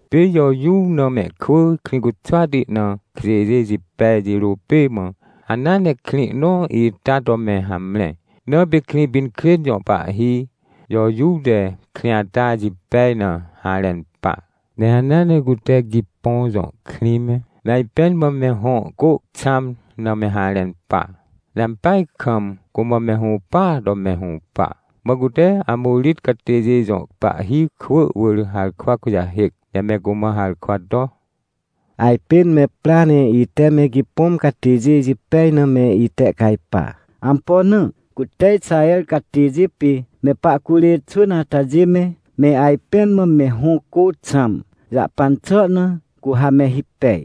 Pê Jojuw na mehkwỳ Krĩcuxwati na kjêjê jipej jirô pê mã, hanea nekrĩ nõ ita to me hamre. Na pêKrĩpinkrên jõ pahhi, Jojuw te krĩ atajê jipej na harẽn pa, ne hanea ne cute Gipõm jõ krĩ me, me ajpẽn mã mehõ cô xãm na me harẽn pa, ne ampeaj kamcumã me hũpaa to me hũpa. Mã cute Amorit catêjê jõ pahhi kwỳ wỳrharkwa kujahêc, ne me cumã harkwa to: — Ajpên me pra ne ite me Gipõm catêjê jipej na me itehcajpa. Ampo na? Cute Ixaher catêjê pê me pahcurê xwỳn atajê me, me ajpẽn mãme hõ cô xãm jahpan xà na, cu ha me hipej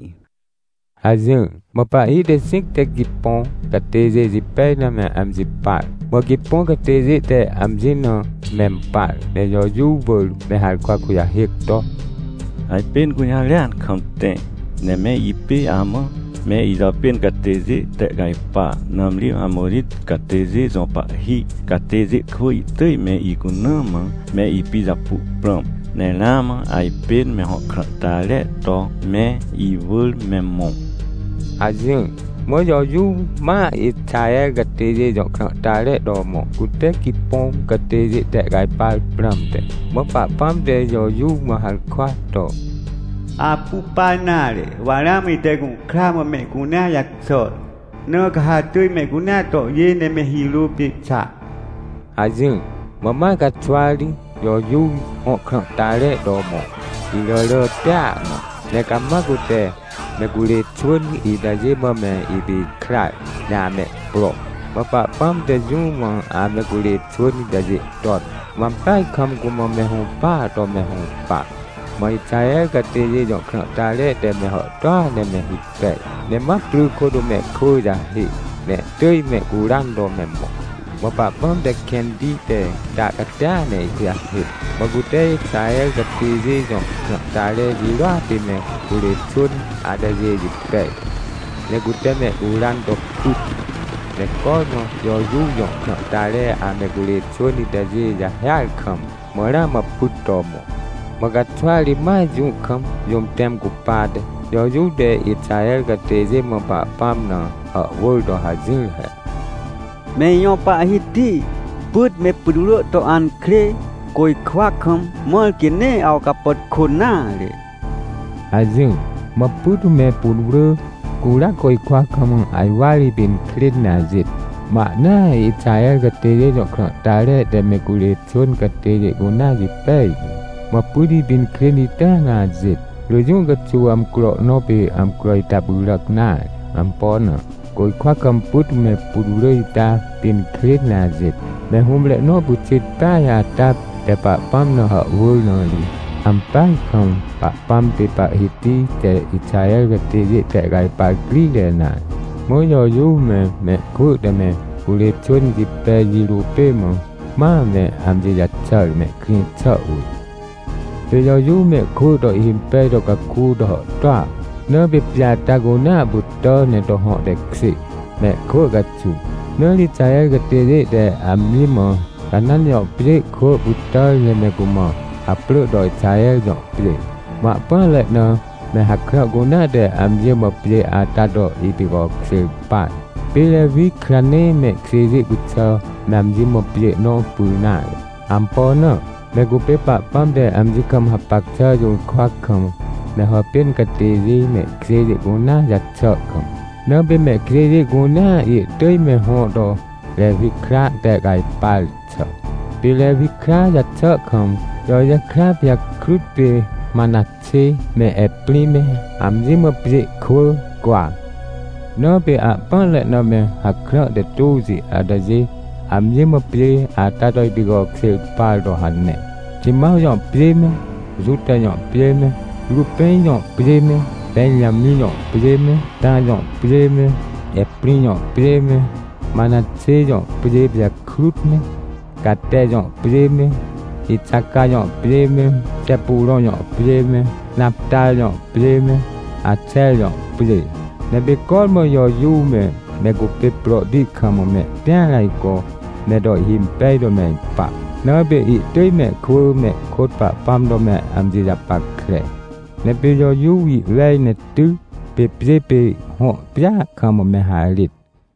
— hajỹr. Mã pahhi texĩc te Gipõm catêjê jipej na me amji par. Mã Gipõm catêjê te amji na mempar, ne Jojuw wỳr me harkwa kujahêc to: — Ajpên gũjarêan kam tẽ, ne me ipê amã me ijàpên catêjê tehcajpa! Nãmri Amorit catêjê jõ pahhi catêjê kwỳ ihtỳj me icuna mã me ipijapu prãm, ne ramãajpên me hõ krãhtare to me iwỳr me mõ — hajỹr. Mã Jojuw ma Ixaher catêjê jõ krãhtare to mõ, cute Gipõm catêjê tehcajpar prãmte. Mã Pahpãm te Jojuw mã harkwa to: — Apu pa nare, wa ramã ite gũhkra mã mehcunea jaxàr, na ca ha atỳjmehcunea tohjê ne me hirô pê xa — hajỹr. Mã ma caxwari Jojuw hõ krãhtare to mõ, iràràtia na, ne cama cute me curê xwỳn itajê mã me ipikrar, ne amehpro. Mã Pahpãm te jũmã ame curê xwỳn itajê ton, mã ampeaj kam cumã me hũpaa to me hũpa. Mã Ixaher catêjê jõ krãhtare te me hàhtôa ne me hipej, ne mapry kôt mehkwỳ jahê, ne ihtỳj mehcuran to me mõ. Mã Pahpãm te kẽntite ta catia ne ihkujahêc, mã cute Ixaher catêjê jõ krãhtare jirôa pê me curê xwỳn atajê jipej. Ne cute mehcuran to pyt. Ne cormã Jojuw jõ krãhtare ame curê xwỳn itajê jahêar kam, mã ramãpyt to mõ. Mã caxwari ma jũ kam, jũm tẽm cupate, Jojuw te Ixaher catêjê mã Pahpãm na hàhwỳr to hajỹr he: — Me ijõ Pahhiti, pyt me putwrỳ to ankrê, côjkwa kam, mãr quê neeawcapàtkô nare — hajỹr. Mã pyt me putwrỳ curia côjkwa kam ajwar ipinkrên ne ajêt, mã ahnaa Ixahercatêjê jõ krãhtare te me curê xwỳn catêjê cunea jipej tu. Mã pytipinkrên itaa na ajêt. Rỳ jũ caxuw amcro nõ pê amcro ita pyràc nare. Ampo na? Côjkwa kam pyt me putwrỳ ita pinkrên ne ajêt, me hũmre nõpyxit peaj ata te Pahpãm na hàhwỳr na ri. Ampeaj kam Pahpãm pê Pahhitite Ixaher catêjê tehcajpar crire nare. Mã Jojuw me, mehkwỳ te me curê xwỳnjipej jirô pê mã, ma me amji jaxàr, mehkrĩ xà wỳr. Pê Jojuw mehkwỳ to ihhimpej to caku to hàhtôa. Na pê pjê ata cunea pytà ne to hõ tekjê, mehkwỳ caxuw. Na ri Ixaher catêjê te amji mã Canãn jõ pjê kwỳ pytàr ne me cumã haprỳ to Ixaher jõ pjê. Mã ahpỹanre na me hakrã cunea te amji mã pjê ata to ipicokjêr par. Pê Rewi kra nee mehkjêjê cuxà me amji mã pjê nõ pyr nare. Ampo na? Me cupê Pahpãm te amji kam hapac xà jũrkwa kam me hàpên catêjê, mehkjêjê cunea jaxà kam. Na pê mehkjêjê cunea ihtỳj me hõ to Rewi kra tehcajpar xà. Pê Rewi kra jaxà kam, Joje kra pijakrut pê Manaxê me Eprĩ me amji mã pjê kwỳ cwa. Na pê ahpỹanre na me hakrã te tôxi atajê amji mã pjê ata toipicokjêr par to hane: Ximãw jõ pjê me, Juta jõ pjê me, Rupẽn jõ pjê me, Pẽnjamĩ jõ pjê me, Tã jõ pjê me, Eprĩ jõ pjê me, Manaxê jõ pjê pijakrut me, Cate jõ pjê me, Ixaca jõ pjê me, Xepurõ jõ pjê me, Naptar jõ pjê me, Axer jõ pjê. Ne pê cormã Jojuw me, me cupê prohti kam mehtĩar ajco me to ihhimpej to me ipa, na pê ihtỳj mehkwỳ mehkôt Pahpãm to me amji japackre. Ne pê Jojuw ihwej ne ty, pê pjê pê hõ pjêa kam me harêt.